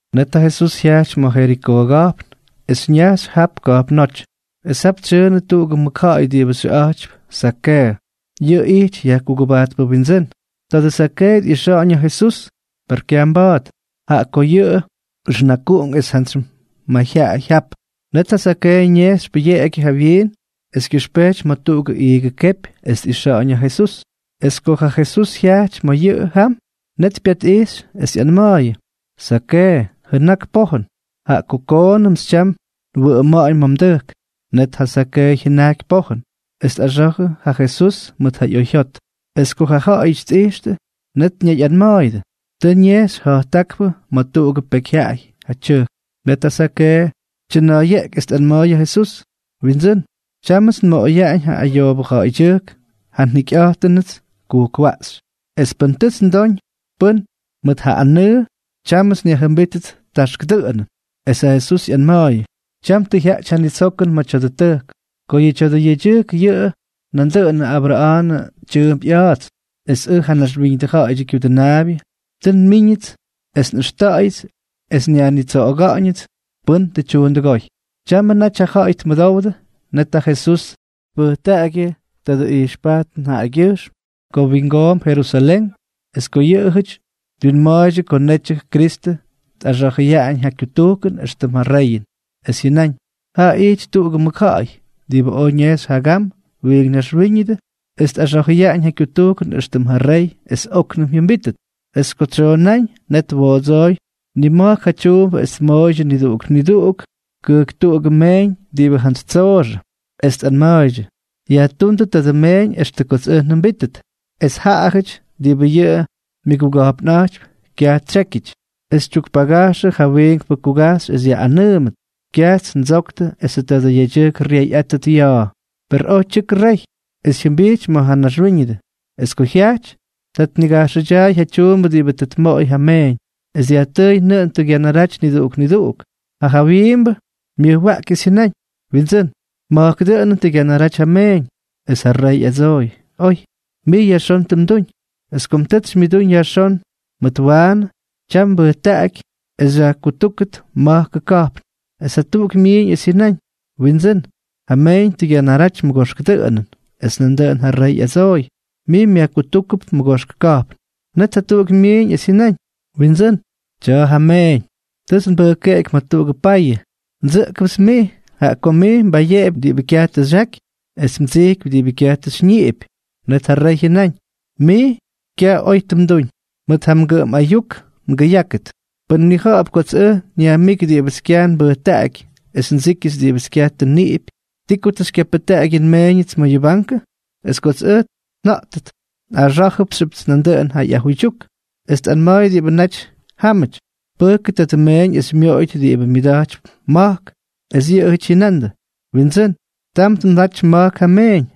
Net ja Jesús jyajty ma̱ Jerikoo ka̱jpn es ñajxy jap ka̱jpnóty. Es jap tsyʉʉnʉ tuꞌugʉ mʉkja̱ꞌa̱y diꞌibʉ xyʉꞌa̱jtypy Zakeeʉ. Yʉꞌʉ ijty yajkugʉbajtpʉ windsʉ́n. Tadʉ Zakeeʉ tꞌixa̱ꞌa̱ñ ja Jesús. Per kyaj mba̱a̱t, jaꞌa ko yʉꞌʉ ʉxnakuꞌunk es jantsy mayjyaꞌay jap. Net ja Zakeeʉ ñejxy pʉyeꞌegyʉ jawyiin es kyʉxpejty ma̱ tuꞌugʉ iigʉ kepy es tꞌixa̱ꞌa̱ñ ja Jesús. Es ko ja Jesús jyajty ma̱ yʉꞌʉ jam, net pyatꞌijxy es ꞌyanma̱a̱yʉ: —Zakeeʉ, jʉnak pojʉn, jaꞌa ko koonʉmts tyam nwʉꞌʉma̱ꞌa̱ñ ma̱ mdʉjk. Net ja Zakeeʉ jyʉnajky pojʉn, es tꞌaxa̱jʉ ja Jesús mʉt ja oyjyot. Es ko ja ja̱ꞌa̱yʉty tꞌijxtʉ, net ñayꞌanma̱a̱yʉdʉ: —Tʉ ñejxy ja̱jttákpʉ ma̱ tuꞌugʉ pekyjyaꞌay ja tyʉjk. Net ja Zakeeʉ tyʉna̱a̱yeꞌky es tꞌanma̱a̱y ja Jesús: —Windsʉ́n, tyámʉts nmoꞌoyaꞌañ ja ayoobʉ ja̱ꞌa̱ydyʉjk ja njikyꞌa̱jtʉnʉts kujkwaꞌxy. Es pʉn tʉts ndoñ pʉ́n mʉt ja anʉʉ, tyámʉts nyajjʉmbítʉt taxk dʉꞌʉnʉn. Es ja Jesús ꞌyanma̱a̱yʉ: —Tyam tʉ jyaꞌty ja nitsokʉn ma̱ tya̱dʉ tʉjk, ko yʉ tya̱dʉ yedyʉjk yʉꞌʉ nandʉꞌʉnʉ Abra̱a̱nʉ tyʉʉmp ꞌya̱a̱ts. Es ʉj, ja Naxwíñʉdʉ Ja̱ꞌa̱yʉdyʉ Kyudʉnaabyʉ, tʉ nmíñʉts es nꞌʉxta̱ꞌa̱yʉts es nyajnitsoꞌoga̱ꞌa̱ñʉts pʉ́n tʉ tyuundʉgóy. Tyamʉ naty ja ja̱ꞌa̱y tmʉdowdʉ, net ja Jesús tpʉjtaꞌagyʉ tadʉ ijxpajtʉn jaꞌagyʉjxm ko wyingoomp Jerusalén es ko yʉꞌʉjʉty wyinmaydyʉ ko netyʉ ja Kristʉ tꞌaxa̱jʉyaꞌañ ja kyutujkʉn éxtʉm ja reyʉn. Es jyʉnáñ: —Jaa ijty tuꞌugʉ mʉkja̱ꞌa̱y diꞌibʉ oj ñejxy jagam wiink naxwíñʉdʉ es tꞌaxa̱jʉyaꞌañ ja kyutujkʉn éxtʉm ja rey es óknʉm jyʉmbítʉt. Es ko tsyoonáñ, net twoodsooy nima̱jk ja tyuumbʉ es tmooydyʉ niduꞌuk niduꞌuk kʉjktuꞌugʉ meeñ diꞌibʉ jantsy tsooxʉ, es tꞌanma̱a̱ydyʉ: “Yajtúndʉ tadʉ meeñ extʉ kots ʉj njʉmbítʉt.” Es ja ja̱ꞌa̱yʉty diꞌibʉ yʉꞌʉ myʉguga̱jpnꞌa̱jtypy kyaj tsyékyʉty, es tyukpagajxʉ ja wiinkpʉ kugajxy es yaꞌꞌanʉʉmʉt: “Kyajts ndsoktʉ esʉ tadʉ yedyʉjk ryeyꞌátʉt ya̱a̱.” ’Per oj tyʉkʉ rey, es jyʉmbijty ma̱ ja ñaxwíñʉdʉ. Es ko jyajty, ta tnigajxʉdyaay ja tyuumbʉ diꞌibʉ tʉ tmoꞌoy ja meeñ. Es dyajtʉʉy nʉꞌʉn tʉ gyanaraty niduꞌuk niduꞌuk. Ja jawyiimbʉ myʉjwaꞌky es jyʉnáñ: “Windsʉ́n, ma̱jkʉ dʉꞌʉnʉn tʉ gyanaraty ja mmeeñ.” Es ja rey ꞌyadsooy: “Oy. Mij yajxón tʉ mduñ. Es ko tʉts xymyʉdúñ yajxón mʉt waanʉ, tyam nbʉjtaꞌaky es xyajkutúkʉt ma̱jkʉ ka̱jpn.” Es jatuꞌuk myiiñ es jyʉnáñ: “Windsʉ́n, ja mmeeñ tʉ gyanaraty mʉgoxk dʉꞌʉnʉn.” Es nandʉꞌʉn ja rey ꞌyadsooy: “Mij myajkutúkʉp mʉgoxkʉ ka̱jpn.” Net jatuꞌuk myiiñ es jyʉnáñ: “Windsʉ́n, tya̱a̱ ja mmeeñ. Tʉts nbʉjkeꞌeky ma̱ tuꞌugʉ payʉ. Ndsʉꞌkʉpts mij, jaꞌa ko mij mbayeꞌepy diꞌibʉ kyaj tʉ xyaky es mdsijkypy diꞌibʉ kyaj tʉ xyñiꞌipy.” Net ja rey jyʉnáñ: “Mij, kyaj oy tʉ mduñ. Mʉt ja mgʉꞌʉm ayuk ngʉyákʉt. Pʉn mnija̱ꞌa̱p kots ʉj nyajmíky diꞌibʉts kyaj nbʉjtaꞌaky es ndsíkyʉts diꞌibʉts kyaj tʉ nniꞌipy, ¿ti ko tʉ xykyapʉjtaꞌaky yʉ nmeeñʉts ma̱ yʉ bankʉ?, es kots ʉj nja̱ꞌtʉt nꞌaxá̱jʉdʉts nandʉꞌʉn yʉ ꞌyajuydyuk.” Es tꞌanma̱a̱y diꞌibʉ naty jámʉty: “Pʉjkʉ tadʉ meeñ es xymyoꞌoyʉt diꞌibʉ myʉda̱jtypy ma̱jk.” Es yʉꞌʉjʉty jyʉnandʉ: “Windsʉ́n, ¡tam tmʉdaty ma̱jk ja meeñ!”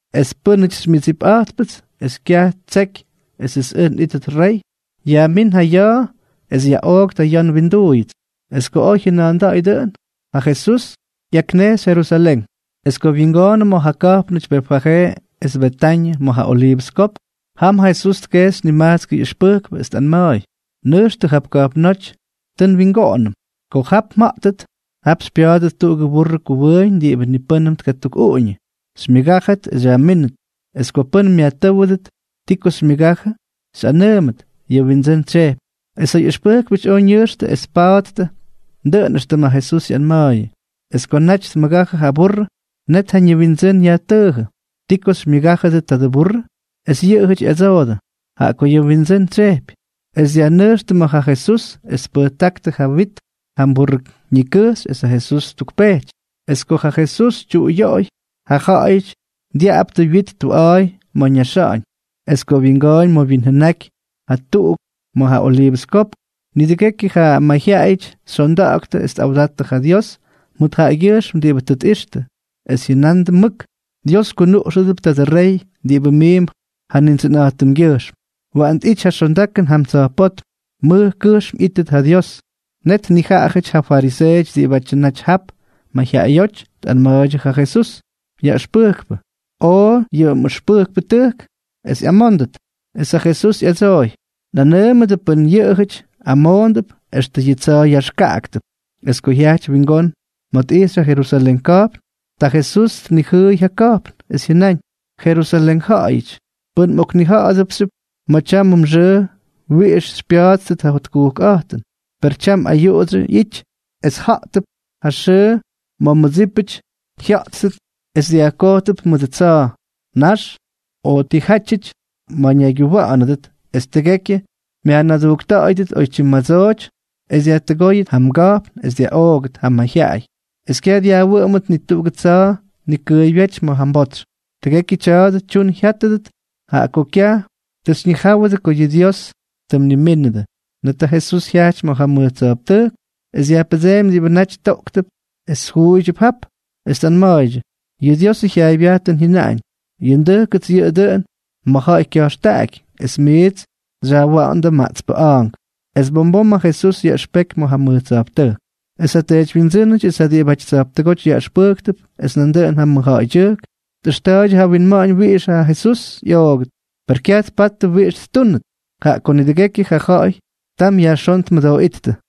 Es pʉ́nʉty xymyʉdsipꞌa̱jtpʉts es kyaj ttseky esʉts ʉj nꞌítʉt rey, yajmín ja ya̱a̱ es yaꞌooktʉ ya̱ nwinduuyʉts.” Es ko oj jyʉna̱a̱nda̱ꞌa̱y dʉꞌʉn, ja Jesús ꞌyaknejxy Jerusalén. Es ko wyingoonʉ ma̱ ja ka̱jpnʉty Betfajee es Betañʉ, ma̱ ja Oliivʉs Kopk, jam ja Jesús tkejxy nimajtskʉ ꞌyʉxpʉjkpʉ, es tꞌanma̱a̱y: —Nʉjxtʉ jap ka̱jpnóty tʉ nwingoꞌonʉm. Ko jap mja̱ꞌttʉt, jap xypya̱a̱dʉt tuꞌugʉ burrʉ kuwʉʉñ diꞌibʉ ni pʉ́nnʉm tkatukꞌuꞌuñʉ. Xymyʉgájʉt es xyajmínʉt. Es ko pʉ́n myajtʉ́wʉdʉt ti ko xymyʉgajʉ, xyꞌanʉʉmʉt: “Ja Windsʉ́n tsyejpy.” Es ja ꞌyʉxpʉjkpʉty oj ñʉjxtʉ es tpattʉ dʉꞌʉn éxtʉm ja Jesús ꞌyanma̱a̱yʉ. Es ko naty tmʉgajʉ ja burrʉ, net ja ñiwindsʉ́n yajtʉʉjʉ: —¿Ti ko xymyʉgájʉdʉ tadʉ burrʉ? Es yʉꞌʉjʉty ꞌyadsoodʉ: —Jaꞌa ko yʉꞌʉ Windsʉ́n tsyejpy. Es dyajnʉjxtʉ ma̱ ja Jesús es tpʉjtáktʉ ja wyit jam burrʉ ñikʉjxy es ja Jesús ttukpejty. Es ko ja Jesús tyuꞌuyoꞌoy, ja ja̱ꞌa̱yʉty dyaꞌaptʉ wyit tuꞌa̱a̱y ma̱ ñaxa̱ꞌa̱ñ. Es ko wyingooñ ma̱ wyinjʉnaky ja tuꞌu ma̱ ja Oliivʉs Kopk, nidʉgekyʉ ja mayjyaꞌayʉty xyondaktʉ es tꞌawda̱jttʉ ja Dios mʉt jaꞌagyʉjxm diꞌibʉ tʉ tꞌixtʉ, es jyʉnandʉ mʉk: —¡Dios kyunuꞌxʉbʉ tadʉ rey diꞌibʉ miimp ja Nindsʉnꞌa̱jtʉmgyʉjxm! ¡Waꞌan tꞌity ja xondakʉn jam tsa̱jpótm! ¡Mʉj kʉjxm ꞌyítʉt ja Dios! Net nijaꞌajʉty ja fariseeʉty diꞌibʉ naty jap mayjyaꞌayóty tꞌanma̱a̱ydyʉ ja Jesús: —Yaꞌʉxpʉjkpʉ, oo yʉ mꞌʉxpʉjkpʉtʉjk es ꞌyamóndʉt. Es ja Jesús ꞌyadsooy: —Nꞌanʉʉmʉdʉ pʉn yʉꞌʉjʉty amoondʉp, extʉ yʉ tsa̱a̱ yaxkaꞌaktʉp. Es ko jyajty wingón ma̱ tꞌijxy ja Jerusalén ka̱jpn, ta ja Jesús tnijʉʉy ja ka̱jpn, es jyʉnáñ: —Jerusalén ja̱ꞌa̱yʉty, pʉn mꞌoknija̱ꞌa̱dʉpxyʉp ma̱ tyamʉ mxʉʉ wiꞌix xypya̱a̱ttʉt ja jotkujkꞌa̱jtʉn. Per tyam ayuꞌudsyʉ ꞌyity ma̱ miidsʉty. Es ja̱ꞌtʉp ja xʉʉ ma̱ mmʉdsípʉty jya̱ꞌttʉt es dyajkojtʉp mʉdʉ tsa̱a̱, nax, o tijátyʉty ma̱ ñaygyuwa̱ꞌa̱nʉdʉt, es tʉgekyʉ myajnadujkta̱ꞌa̱yʉdʉt oytyim madsooty es dyajtʉgóyʉt ja mga̱jpn es dyaꞌoogʉt ja mja̱ꞌa̱yʉty, es kyaj dyajwʉꞌʉmʉt ni tuꞌugʉ tsa̱a̱ nikʉʉybyéty ma̱ ja mbotsy. Tʉgekyʉ tya̱a̱dʉ tyun jyátʉt jaꞌa ko kyaj tʉ xyñijáwʉdʉ ko yʉ Dios tʉ mnimínʉdʉ. Net ja Jesús jyajty ma̱ ja mʉj tsa̱jptʉjk es dyajpʉdseemy diꞌibʉ naty toꞌktʉp es juuydyʉp jap, es tꞌanma̱a̱ydyʉ: —Yʉ Diosʉ jyaaybyajtʉn jyʉnaꞌañ: “Yʉ ndʉjkʉts yʉꞌʉ dʉꞌʉn ma̱ ja̱ꞌa̱y kya̱jxtaꞌaky”, es miits xyajwa̱ꞌa̱ndʉ maꞌtspʉ a̱a̱nk. Es bom bom ja Jesús yaꞌʉxpeky ma̱ ja mʉj tsa̱jptʉjk. Es ja teedywyindsʉ́nʉty es ja diꞌibʉty tsa̱jptʉgóty yaꞌʉxpʉjktʉp es nandʉꞌʉn ja mʉjja̱ꞌa̱ydyʉjk tꞌʉxta̱ꞌa̱ydyʉ ja winma̱ꞌa̱ñ wiꞌix ja Jesús ꞌyoogʉt. Per kyaj tpattʉ wiꞌix ttúnʉt, jaꞌa ko nidʉgekyʉ ja ja̱ꞌa̱y tam yajxón tmʉdooꞌíttʉ.